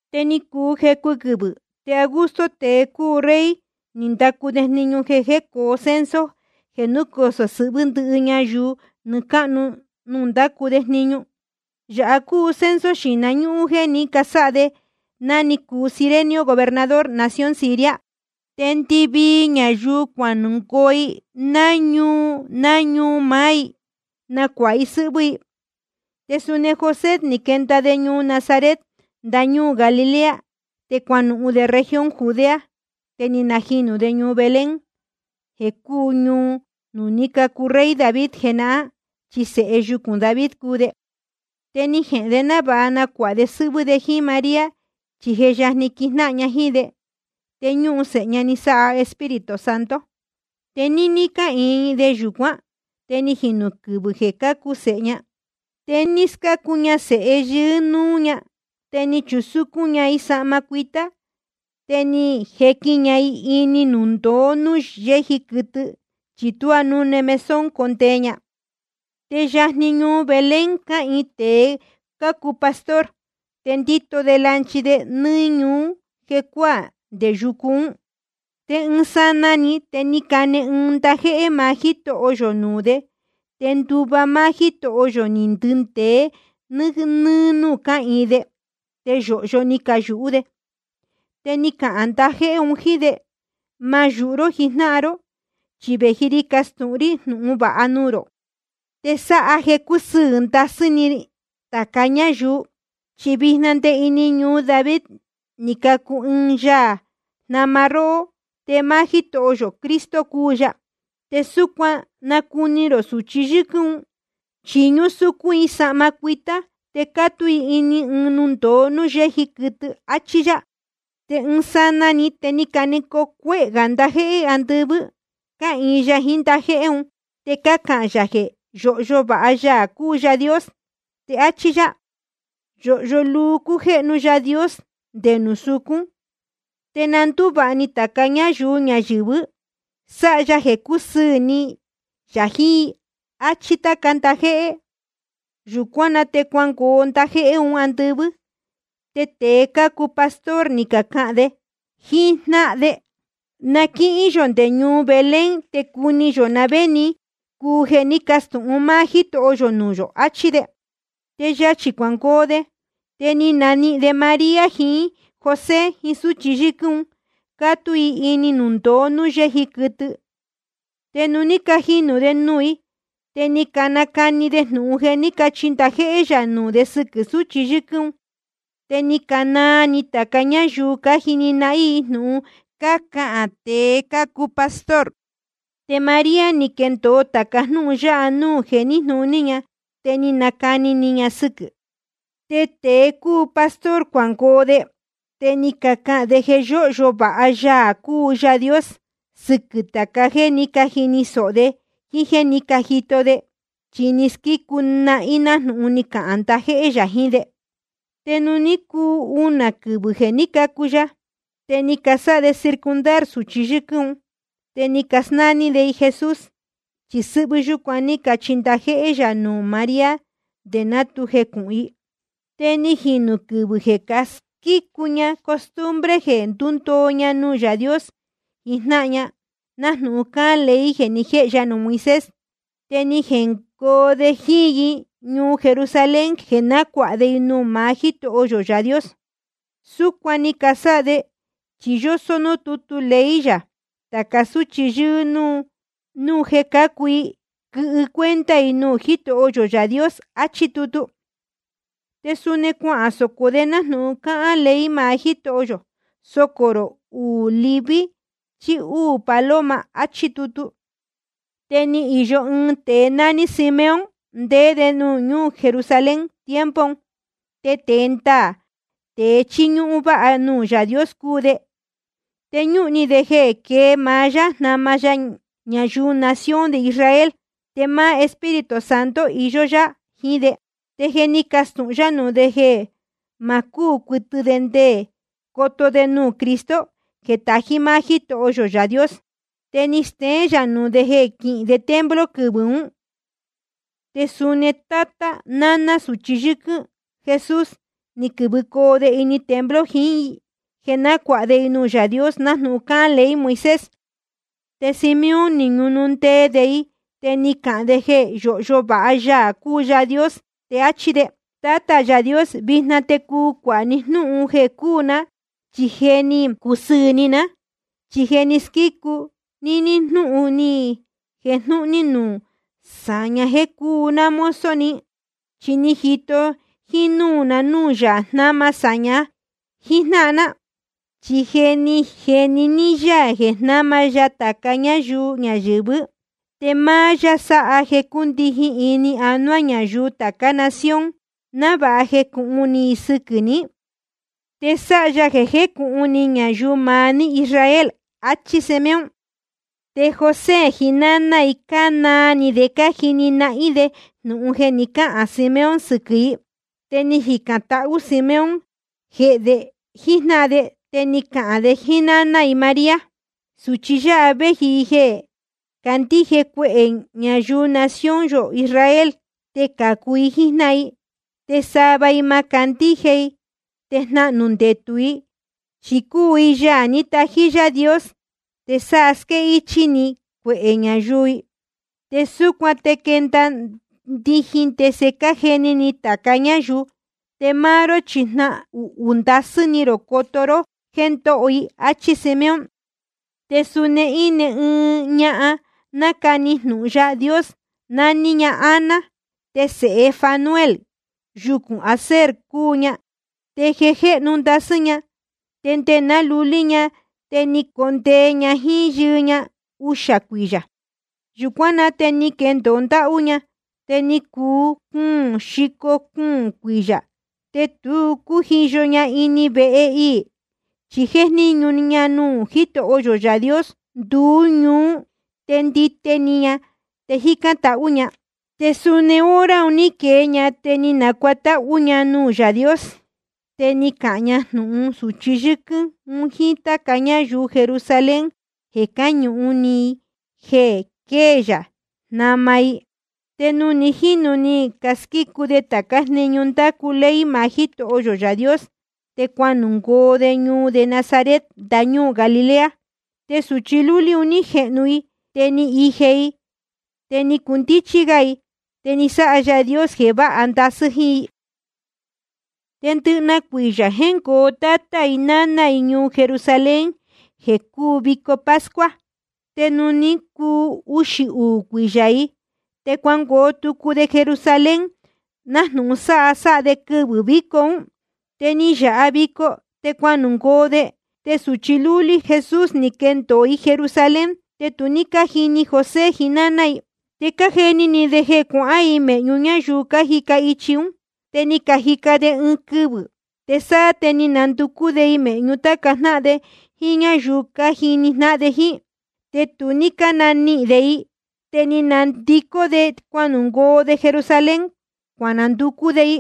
Te ni cuu jecu quɨvɨ̄, te Augusto, tēe cúu rey, ni ndacu de jniñu jeē coo censo jeē núcosō sɨhvɨ́ ndɨvii ñayuu nɨɨ́ cáhnu nuū ndácu de jniñu. Yāha cúu censo xīhna ñúhún jéē ní casáha de ná ni cuu Cirenio gobernador nación Siria. Te ndɨvii ñayuu cuanungoo i ná ñuu ná ñuu maá i jeē nácuāha i sɨ́hvɨ́ i. Te suni José ni quenda de ñuu Nazaret, ndañúū Galilea. Te cuanuhun de región Judea, te ni najinū de ñuu Belén, jeē cúu ñuu nuū ní cacu rey David jenahán. Chi sēhe yucūn David cúu de. Te ni jehēn de návāha nacuāha de sɨ́hvɨ́ de jíín María, chi je yajni quijnáhan ña jíín de. Te ñúhun sēhe ña ni sáha Espíritu Santo. Te níní cáhīin de yūcuán te ni jinū quɨvɨ̄ jeē cácu sēhe ña. Te ni scácu ña sēhe yɨɨ́ núú ña, te ni chusúcún ña i sahma cuitá, te ni jequin ña i ini ɨɨn nundōo núū yéji quɨtɨ, chi tuá núne mesón condee ña. Te yajni ñuu Belén cáhīin tēe cácuu pastor, te cándito de lanchi de nɨ́ɨ́ niñu jecuáā nde yucu ún. Te ɨɨn sanaa‑ni te ni cane ɨɨn ndajéhé maá Jítoho yō nuū de, te nduva máá Jítoho yō ni ndindēe nɨ́ɨ́ núū cáhīin de. Te yōhyo ni cayūhú de. Te ni cahān ndajéhé un jíín de: Ma yūhu ró jijnáhan ró, chi vēji ri castūhun rí jnūhun vāha nuū rō, te sáha jeē cúsɨɨ̄ ndasɨ́ ni tāca ñáyuu: Chi vijna nde ini ñuu David ni cacu ɨɨn Yaā jnama róhó, te máá Jítoho yō Cristo cúu ya. Te súcuan nacuni rō sūchi yɨ́quɨ́n un, chi ñúsúcún i sahma cuitá te cátú i ini ɨɨn nundōo núū yéji quɨtɨ. Achí yá. Te ɨɨn sanaa‑ni te ni canecoo cuehē gā ndajéhé andɨvɨ́, cáhīin ya jiín ndajéhé un, te cácahān yā jeē yóhyo vāha Yaā cúu Yaā Dios. Te áchí yá: Yōhyo luu cújéhnu Yaā Dios nde nuū sucún. Te na ndúvāha ni tāca ñáyuu ñayɨ̄vɨ, sáha ya jeē cúsɨɨ̄ ni yā jiín i. Achí táca ndajéhé. Yūcuán na te cuanungoo ndajéhé un andɨvɨ́. Te tēe cácuu pastor ni cacahān de jíjnáhan de: Na quíhín yō nde ñuu Belén, te cuni yō na vé ni cuu jeē ní castūhun máá Jítoho yō nuū yō, achí de. Te yachī cuangoo de, te ni nanihīn de María jiín José jiín súchi yɨ́quɨ́n un, cátú i ini nundōo núū yéji quɨtɨ. Te nuū ní cajini de nuū i, te ni canacani de jnūhun jeē ní cachi ndajéhé yā nuū de sɨquɨ̄ sūchi yɨ́quɨ́n un. Te ni canaa ni tāca ñáyuu cájini nahín i jnūhun cácahān tēe cácuu pastor. Te María, ni quendōo tāca jnúhun yáha nuū jeē níjnūní ña, te nácani ni ña sɨquɨ̄. Te tēe cácuu pastor cuanungoo de, te ni cacahān de jeē yóhyo vāha Yaā cúu Yaā Dios sɨquɨ̄ tāca jéē ní cajini sōho de jíín jéē ní cajito de, chi ni squícu nahín nájnūhun ni cahān ndajéhé yā jiín de. Te ni cuu unā quɨvɨ̄ jeē ní cacu ya, te ni casáha de circuncidar sūchi yɨ́quɨ́n un. Te ni casnání de i Jesús, chi sɨ́hvɨ́ yúcuan ní cachi ndajéhé yā nuū María nde ná tu jecūhun i. Te ni jīnu quɨvɨ̄ jeē casquícu ña costumbre jeē ndúndoo ña nuū Yaā Dios jijnáhan ña, nájnūhun cáhán ley jeē ni jéhe ya nuū Moisés. Te ni jengoo de jíín i ñuu Jerusalén jeē nácuāha de i nuū maá Jítoho yō Yaā Dios. Súcuan ni casáha de, chi yósó núū tútu ley yā: Tāca súchi yɨ́ɨ́ núú jéē cácacu, quɨhɨ cuenta i nuū Jítoho yō Yaā Dios, achí tutu. Te suni cuasocō de nájnūhun cáhán ley maá Jítoho yō: Socō rō uū lɨvɨ chí úū paloma, achí tutu. Te ni īyo ɨɨn tēe nání Simeón, ndéé de ñuu Jerusalén tiempo un. Te tēe ndaā, tēe chíñúhún váha nuū Yaā Dios cúu de. Te ñúhun ni de jeē quée maá Yaā jnama ñayuu nación de Israel. Te máá Espíritu Santo íyó yá jiín de. Te je ni castūhun yá nuū de jeē ma cúū cuɨtɨ de chi nde coto de nuū Cristo jeē tají maá Jítoho yō Yaā Dios. Te ni steén yā nuū de jeē quihín de templo quɨvɨ̄ ún. Te suni tátá naná sūchi yɨ́quɨ́n Jesús, ni quɨ̄vɨcoo de ini templo jiín i, jeē nácuāha de i nuū Yaā Dios nájnūhun cáhán ley Moisés. Te Simeón ni ñunundee de i, te ni cahān de jeē yóhyo vāha Yaā cúu Yaā Dios, te áchí de: Tátā Yaā Dios, vijna te cuu cuāha ni jnúhun jeē cuu ná, chi je ni cusɨɨ̄ ni ná. Chi je ni squícu ní jnúhun ni jejnūhun ní núū sāña jéē cúu ná mozo ni. Chi ni jito jínúū na núū Yaā jnáma sāña jíjnáhan ná. Chi ni jeni ní yá jeē jnáma ya tāca ñáyuu ñayɨ̄vɨ́. Te máá yá sáha jeē cúndijin ini anuá ñayuu tācá nación, návāha jecūhun ni i sɨquɨ̄ ní. Te sáha ya jeē cujéhnu ñayuu maá ní Israel. Achí Simeón. Te José jiín náná i cánaa ni de cájini nahín de jnūhun ni cahān Simeón sɨquɨ̄ i. Te ni jicān tahú Simeón jehē de jíjnáhan de, te ni cahān de jíín náná i María: Sūchi yáha vēji i jeē candíje cuehē ñayuu nación yō Israel, te cācu i jíjnáhan i. Te sava i ma candíje i, te jnahnū ndetū i. Chi cúu i Yaā ní tají Yaā Dios, te sa squéhichī ni cuehē ñayuu i. Te súcuan te quenda ndijin ndese cájeni ni tāca ñáyuu. Te máá ró chi jnahuhū ndasɨ́ ni rō coto ró jéē ndóho i. Achí Simeón. Te suni íne ɨɨn ñahan nácani jnūhun Yaā Dios, naní ña Ana. Te sēhe Fanuel, yucūn Aser cúu ña. Te je jéhnu ndasɨ́ ña. Te nde ná lulí ña te ni condee ña jíín yɨɨ ña uxā cuiyā. Yūcuán na te ni quendōo ndáhú ña, te ni cuu cuūn xico cuūn cuiyā ña. Te tu cújiyo ña ini vehe iī, chi jéjníñu ña nuū Jítoho yō Yaā Dios nduú ñuú, te ndite ni ña te jícán tahú ña. Te suni hora un ní quee ña, te ni nacuatáhú ña nuū Yaā Dios. Te ni cahān ña jnūhun sūchi yɨ́quɨ́n un jíín táca ñáyuu Jerusalén jeē cáñuhun ni i jeē quée Yaā jnama i. Te ni jīnu ni casquícu de tācá jniñu ndácu ley maá Jítoho yō Yaā Dios, te cuanungoo de ñuu de Nazaret, ndañúū Galilea. Te sūchi lúlí un ní jehnu i, te ni ije i, te ni cundíchí gá i. Te ni sáha Yaā Dios jeē váha ndasɨ́ jíín i. Te ndɨjnahan cuiyā jéngoo tátá i náná i ñuu Jerusalén, jeē cúu vico pascua. Te nuū ní cuu uxī uū cuiyā i, te cuangoo tucu de Jerusalén, nájnūhun sáha sáha de quɨvɨ̄ víco ún. Te ni yāha vico, te cuanungoo de. Te sūchi lúlí Jesús, ni quendōo i Jerusalén, te tu ní cájini José jiín náná i. Te cájeni ni de jeē cuahán i mēhñu ñáyuu cájica ichi ún. Te ni cajica de ɨɨn quɨvɨ̄, te sáá te ni cananducú de i mēhñu táca jnáhan de jíín ñáyuu cájini jnáhan de jíín. Te tu ní cánanihīn de i. Te ni canandicó de cuangoo de Jerusalén, cuananducú de i.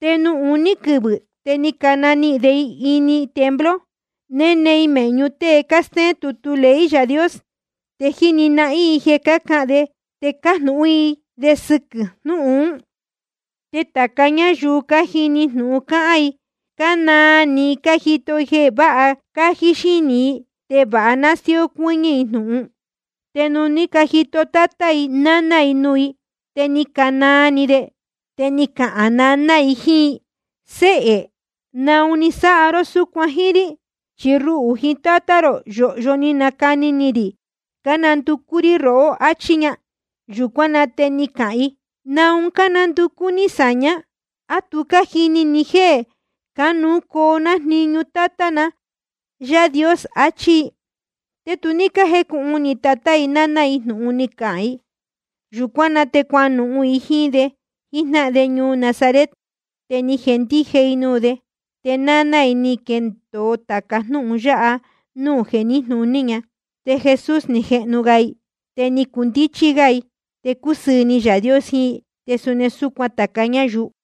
Te nuū uní quɨvɨ̄ te ni cananihīn de i ini templo, néne i mēhñu tée cástéén tutu ley Yaā Dios, te jíni nahín i jeē cácahān de te cájnūhún i de sɨquɨ̄ jnúhun ún. Te tāca ñáyuu cájini jnūhun cáhán i, cánaa ni cájito jeē váha cájí xínī i te vāha nástíó cuɨ́ñɨ́ i jnūhun. Te nuū ní cajito tátá i náná i nuū i, te ni canaa ni de. Te ni cahān naná i jíín i: Séhē, ¿naun ni sáha ró súcuan jíín rí? Chi ruhū jiín tátá rō, yōhyo ni canacani ni rī cánanducú rí rohó, achí ña. Yūcuán na te ni cahān i: ¿Naun cánanducú ní sāña? ¿A tu cájini ni jéē cánuú cocu ná jíín jniñu Tátá na Yaā Dios? Achí i. Te tu ní cájecūhun ni tátá i náná i jnūhun ni cahān i. Yūcuán na te cuanuhun i jíín de jíjnáhan de ñuu Nazaret, te ni jendije i nuū de. Te náná i, ni quendōo tāca jnúhun yáha núū jeē níjnūní ña. Te Jesús ni jehnu ga i, te ni cundíchí gá i, te cúsɨɨ̄ ni Yaā Dios jiín i, te suni súcuan tāca ñáyuu.